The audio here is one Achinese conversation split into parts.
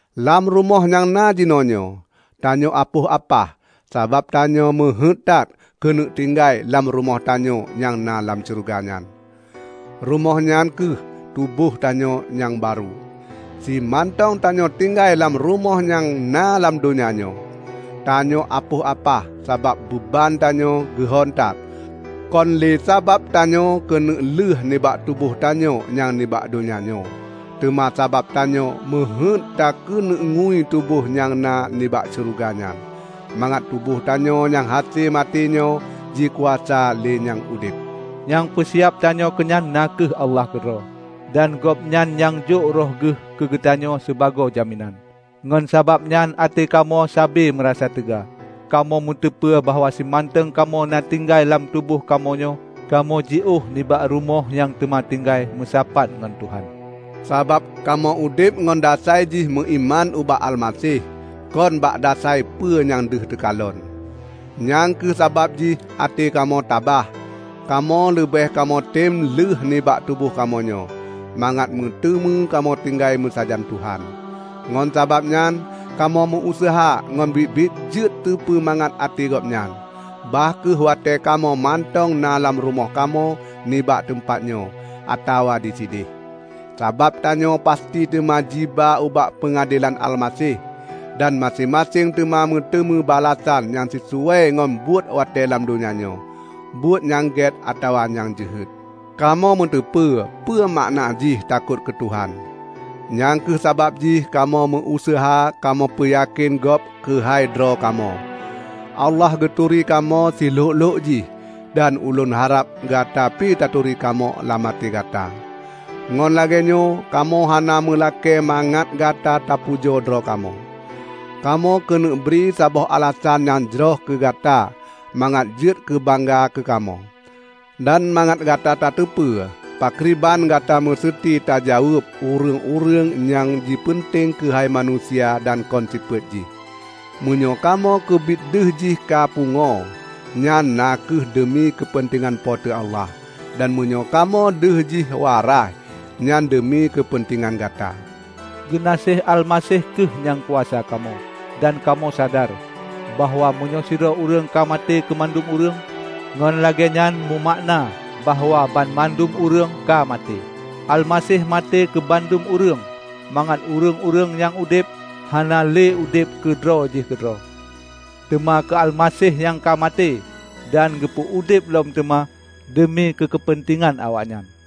Lam rumoh nyang na jinoenyoe, tanyoe apoh apah sabab tanyoe meuheuét that keuneuk tinggai lam rumoh tanyoe nyang na lam syeuruga nyan. Rumoh nyan kheueh tuboh tanyoe nyang barô. Simantong tanyoe tinggai lam rumoh nyang na lam donya nyoe, tanyoe apoh apah sabab beuban tanyoe geuhon that. Kon lé sabab tanyoe keuneuk lheuh nibak tuboh tanyoe nyang nibak donya nyoe, teuma sabab tanyoe meuheuét takeuneuk ngui tuboh nyang na nibak syeuruga nyan, mangat tuboh tanyoe nyang hase maté nyoe jikuasa lé nyang udeb. Nyang peusiab tanyoe keunyan na kheueh Allah keudroe, dan Gobnyan nyang jok Roh geuh keugeutanyoe sibagoe jaminan. Ngon sabab nyan até kamoe sabe meurasa teuga. Kamoe meuteupeu bahwa simantong kamoe na tinggai lam tuboh kamoe nyoe, kamoe jiôh nibak rumoh nyang teuma tinggai meusapat ngon Tuhan. Sabab kamoe udeb ngon dasai jih meuiman ubak Almaseh, kon bak dasai peue nyang deuh teukalon, nyang kheueh sabab jih até kamoe tabah. Kamoe leubeh kamoe tem lheueh nibak tuboh kamoe nyoe, mangat meuteumé kamoe tinggai meusajan Tuhan. Ngon sabab nyan kamoe meu-useuha ngon biet-biet jeuet teupeu mangat até Gobnyan, bah kheueh watée kamoe mantong na lam rumoh kamoe nibak teumpat nyoe, atawa disideh. Sabab tanyoe pasti teuma jiba ubak peungadelan Almaseh, dan maséng-maséng teuma meuteumé balasan nyang sisuai ngon buet watée lam donya nyoe -- buet nyang gét atawa nyang jeuhet. Kamoe meuteupeu peue makna jih takot keu Tuhan; nyang kheueh sabab jih kamoe meu-useuha kamoe peuyakén gob keuhai droe kamoe. Allah geuturi kamoe silhok-lhok jih, dan ulôn harab gata pi taturi kamoe lam até gata. Ngon lagée nyoe kamoe hana meulakée mangat gata tapujoe droe kamoe. Kamoe keuneuk bri saboh alasan nyang jroh keu gata mangat jeuet keubangga keukamoe, dan mangat gata tateupeue pakriban gata meuseuti tajaweueb ureuëng-ureuëng nyang jipeunteng keuhai manusia dan kon sifeuet jih. Meunyoe kamoe keubit deuh jih ka pungoe, nyan na kheueh deumi keupeuntengan Po teu Allah. Dan meunyoe kamoe deuh jih waraih, nyan deumi keupeuntengan gata. Geunaséh Almaseh kheueh nyang kuasa kamoe; dan kamoe sadar bahwa meunyoe sidroe ureuëng ka maté keumandum ureuëng, ngon lagée nyan meumakna bahwa banmandum ureuëng ka maté. Almaseh maté keu mandum ureuëng, mangat ureuëng-ureuëng nyang udeb, hana le udeb keu droe jih keudroe, teuma keu Almaseh nyang ka maté dan geupeu udeb lom teuma deumi keu keupeuntengan awaknyan.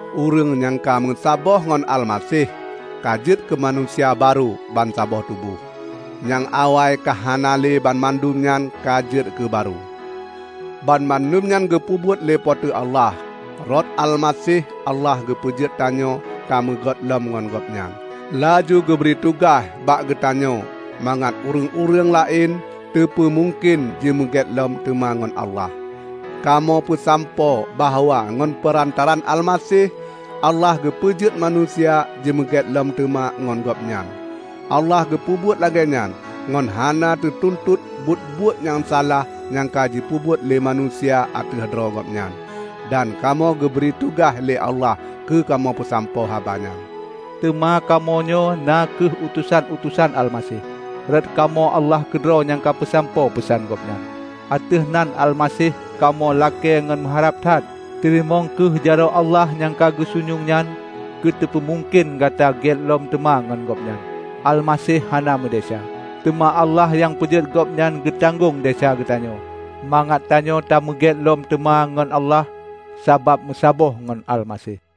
Ureuëng nyang ka meusaboh ngon Almaseh, ka jeuet keumanusia barô bansaboh tuboh. Nyang awai ka hana lé -- banmandum nyan ka jeuet keu barô. Banmandum nyan geupeubuet lé Po teu Allah. Rot Almaseh Allah geupeujeuet tanyoe tameugét lom ngon Gobnyan, laju geubri tugaih bak geutanyoe mangat ureuëng-ureuëng laén teupeu mungken jimeugét lom teuma ngon Allah. Kamoe peusampoe bahwa ngon peurantaraan Almaseh, Allah geupeujeuet manusia jimeugét lom teuma ngon Gobnyan. Allah geupeubuet lagée nyan ngon hana geutuntot buet-buet nyang salah nyang ka jipeubuet lé manusia ateueh droe Gobnyan. Dan kamoe kageubri tugaih lé Allah keu kamoe peusampoe haba nyan. Teuma kamoe nyoe na kheueh utosan-utosan Almaseh. Rot kamoe Allah keudroe nyang peusampoe peusan Gobnyan. Ateueh nan Almaseh, kamoe lakée ngon meuharab that, teurimong kheueh jaroe Allah nyang ka geusunyueng nyan keu teupeumungken gata gét lom teuma ngon Gobnyan. Almaseh hana meudesya, teuma Allah nyang peujeuet Gobnyan geutanggong desya geutanyoe, mangat tanyoe tameugét lom teuma ngon Allah sabab meusaboh ngon Almaseh.